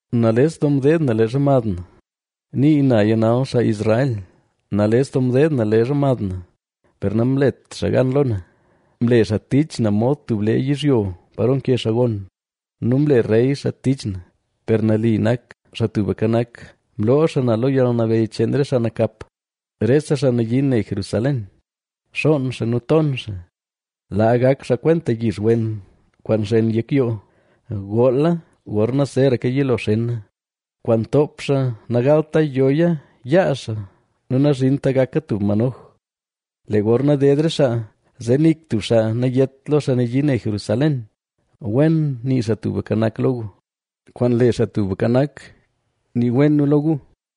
Nales doo mdeed na leezha mad na, nii naya nal xaa Israel, nales doo mdeed na leezha mad na, per namlet xaa gan lo na. Mle xaa tich na mod tub lee yizhyo pa nke xaa gon nu mle rey xaa tich na. Per nali nak, Xaa Tubka Nak; mloo xaa na lo yalnabeyy cheen re xaa nakap. Rese xaa nayii ne Jerusalén, xoon xaa nu ton xaa. Laa gak xaa kwenta yix wen kwaan nxen yek yoo, goola gorna zeraka yilo xena, kwaan ntoop xaa nagalta yoya yaa xaa nu nazhinta gaka tub manoj. Lee gorna ded re xaa, zee nik tub xaa nayét lo xaa nayii ne Jerusalén: “Wen nii Xaa Tubka Nak lo gu; kwaan le Xaa Tubka Nak nii wen nu lo gu.”